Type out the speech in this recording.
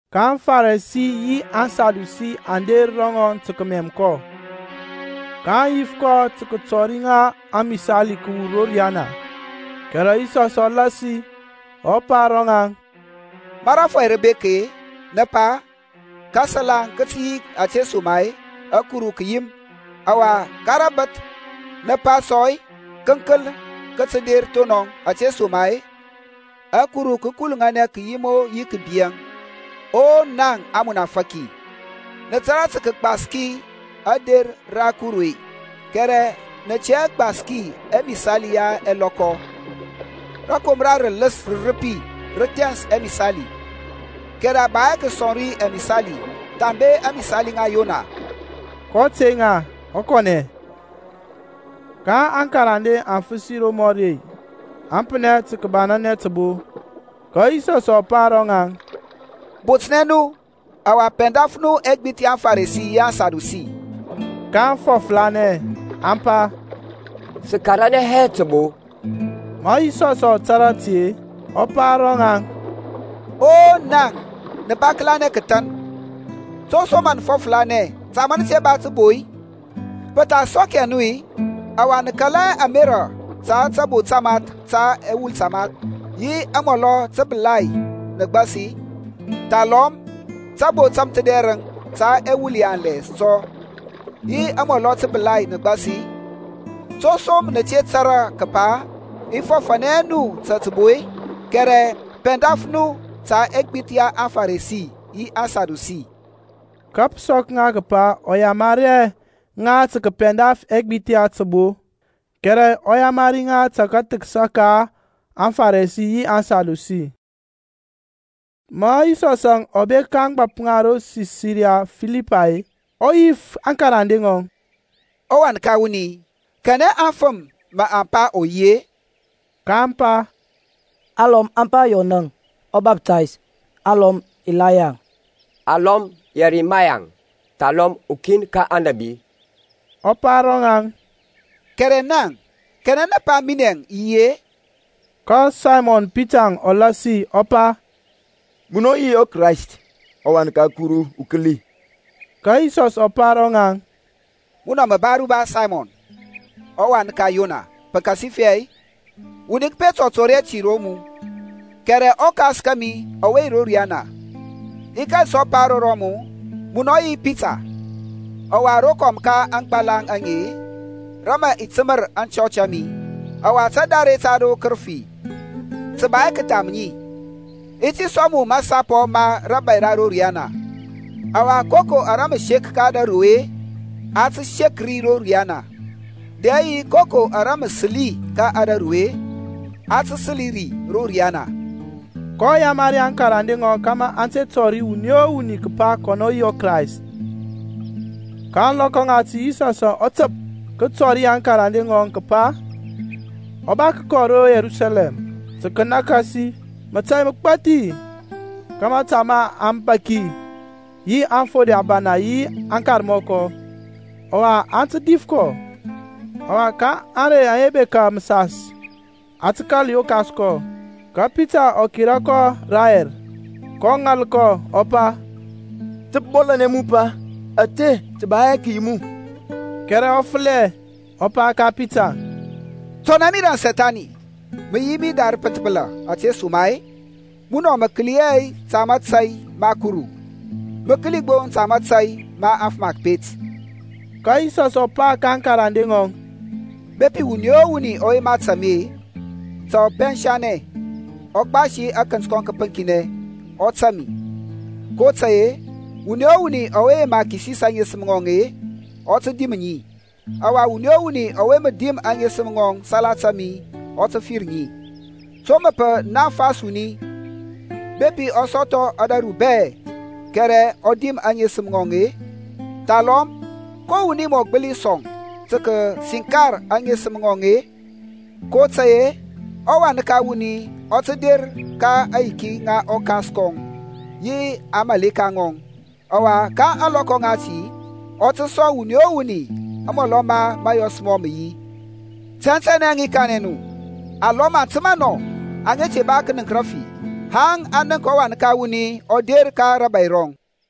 Ka aŋFarisi yi aŋSadusi aŋ der ro ŋɔŋ tǝ kǝmɛm kɔ, kaŋ yif kɔ tǝ kǝtɔri ŋa amisali kǝwur ro riyana. Kɛrɛ Yisɔsȧŋ ɔ lasi, ɔ pa ro ŋaŋ, Ma rȧfɔy rǝ bek-e, nǝ pa, Kǝsalaŋ kǝ tǝ yi ȧtesoma-e ȧkuru kǝ yim. Ɔwa, ka rabǝth nǝ pa sɔ-e, Kǝnkǝl kǝ tǝ der thonɔŋ ȧtesoma-e ȧkuru kǝ kuluŋanɛ kǝyim-o yi kǝbiȧŋ. O naŋ amunafaki, nǝ tȧrȧ tǝ kǝgbaski ȧder ra akuru-e, kɛrɛ nǝ tɛ hɛ gbaski ɛmisali ya ɛlɔkɔ. Rǝkomra rǝlǝs rǝrǝpi rǝ thɛns ɛmisali, kɛrɛ a ba hɛ kǝsɔŋ ri amisali thambe ȧŋmisali ŋa Yona. Kɔ tey ŋa ɔ kɔnɛ. Ma aŋkarande aŋ fǝsi romɔri-e, aŋ pǝnɛ tǝ kǝbananɛ tǝbo. Ka Yisɔs ɔ pa ro ŋaŋ, Botnɛ nu, ɔwa pɛndaf nu ɛgbith ya aŋFarisi yi aŋSadusi. kaŋ fɔfǝranɛ, aŋ pa, Sǝ karanɛ hɛ tǝbo. Ma Yisɔsȧŋ ɔ tȧrȧ ti-e, ɔ pa ro ŋaŋ, O naŋ nǝ ba kǝlanɛ kǝthan, to som mǝ nǝ fɔfǝranɛ ta ma nǝ te ba tǝbo-e? Pǝ tha sɔk hɛ nu-i, ɔwa nǝ kala hɛ ɛmerȧ ta tabo tamath ta ɛwul tamath, yi amɔlɔ tǝbǝlai nǝ gbasi-i? Thalɔm tabo tamthǝdɛrǝŋ ta ɛwul yanlɛ sɔ, yi amɔlɔ tǝbǝlai nǝ gbasi-i? To som nǝ te tȧrȧ kǝpa i fɔfȧnɛ hɛ nu ta tǝbo-e? Kɛrɛ pɛndaf nu ta ɛgbith ya aŋFarisi yi aŋSadusi. Ka pǝ sɔk ŋa kǝpa ɔ yamari hɛ ŋa tǝ kǝpɛndaf ɛgbith ya tǝbo, kɛrɛ ɔ yamari ŋa ta kathǝksa ka aŋFarisi yi aŋSadusi. Ma Yisɔsȧŋ ɔ bek ka ȧŋgbȧp ŋa ro Sisaria Filipay-e, ɔ yif aŋkarande ŋɔŋ, ƆWan ka wuni, kanɛ aŋfǝm mǝ aŋ pa ɔ yi-e? kaŋ pa, Alɔm aŋ pa Yɔnȧŋ ɔBaftays; alɔm Ilayaŋ, alɔm Yɛrimayaŋ, thalɔm ukin ka aŋnabi. Ɔ pa ro ŋaŋ, Kɛrɛ naŋ, kanɛ nǝ pa minɛȧŋ i yi-e? Ka Saymɔn Pitarȧŋ ɔ lasi, ɔ pa, Munɔ yi ɔKrayst, ɔWan ka ɔKuru ukǝli. Ka Yisɔs ɔ pa ro ŋɔŋ, Munɔ mǝ ba aruba Saymɔn ɔwan ka Yona, pǝkasifɛ wuni kǝpet ɔ tɔri hɛ ti ro mu, kɛrɛ ɔKas kȧmi ɔwe yi ro riyana. I kȧl sɔ pa ro rɔmu, Munɔ yi Pita, ɔwa rokɔm ka aŋgbalaŋ aŋe rǝ mǝ i tǝmǝr aŋchɔch a mi; ɔwa tadare ta ro kǝrǝfi tǝ ba hɛ kǝtham ŋi. I ti sɔŋ mu mȧsapɔ ma rȧbȧy ra ro riyana, ɔwa koko ara mǝ sek ka ȧdȧru-e a tǝ sek ri ro riyana, dɛ yi koko ara mǝ sǝli ka ȧdȧru-e a tǝ sǝli ri ro riyana. kɔ yamari aŋkarande ŋɔŋ kȧmȧ aŋ te tɔri wuni o wuni kǝpa kɔnɔ yi ɔKrayst. Ka ȧŋlɔkɔ ŋati Yisɔsȧŋ ɔ tǝp kǝtɔri aŋkarande ŋɔŋ kǝpa ɔ ba kǝkɔ ro Yerusalɛm tǝ kǝnȧkȧsi mətȧy mǝgbȧthi ka mȧta ma aŋbȧki yi aŋfode ȧbana yi aŋkarmɔkɔ, ɔwa aŋ tǝ dif kɔ, ɔwa ka ȧŋrey aŋa bekȧ mǝsas a tǝ kȧl yokas kɔ. Kȧ Pita ɔ kera kɔ rayɛr, kɔ ŋal kɔ, ɔ pa, Ta pǝ bɔlȧnɛ mu Pa. Ȧte tǝ ba hɛ kǝyi mu. Kɛrɛ ɔ fǝlɛ, ɔ pa ka Pita, Tɔnɛ mi raŋ Sethani. Mǝ yi mi da rǝpǝnthbǝla ȧtesoma-e munɔ mǝ kǝli hɛ ta mȧtȧy ma Kuru, mǝ kǝli gbo ta mȧtȧy ma afǝm a kǝpet. Ka Yisɔsȧŋ ɔ pa ka aŋkarande ŋɔŋ, Bepi wuni ɔ wuni ɔ yema tȧŋ mi-e, ta ɔ pɛnsanɛ, ɔ gbasi akǝnt kɔŋ kǝpǝŋkinɛ, ɔ tȧŋ mi. kotȧy-e wuni o wuni ɔwe yema kisis aŋesǝm ŋɔŋ-e, ɔ tǝ dim ŋi; ɔwa wuni o wuni ɔwe mǝ dim aŋesǝm ŋɔŋ salata mi ɔ tǝ fir ŋi. To mǝ pǝ naŋfas wuni bepi ɔ sɔthɔ ȧdȧru bɛ, kɛrɛ ɔ dim aŋesǝm ŋɔŋ-e? Thalɔm ko wuni mǝ ɔ gbǝli sɔŋ tǝ kǝsinkar aŋesǝm ŋɔŋ-e? kotȧy-e ɔWan ka wuni ɔ tǝ der ka aŋyiki ŋa ɔKas kɔŋ yi aŋmȧleka ŋɔŋ. Ɔwa ka ȧŋlɔkɔ ŋati ɔ tǝ sɔŋ wuni o wuni amɔlɔ ma mȧyɔs mɔŋ mǝ yi. Tɛntɛnɛ i kanɛ nu, alɔm aŋ tǝma nɔ aŋa te ba kǝnǝŋk rǝfi, haŋ aŋ nənk ɔWan ka wuni ɔ der ka rȧbȧy rɔŋ.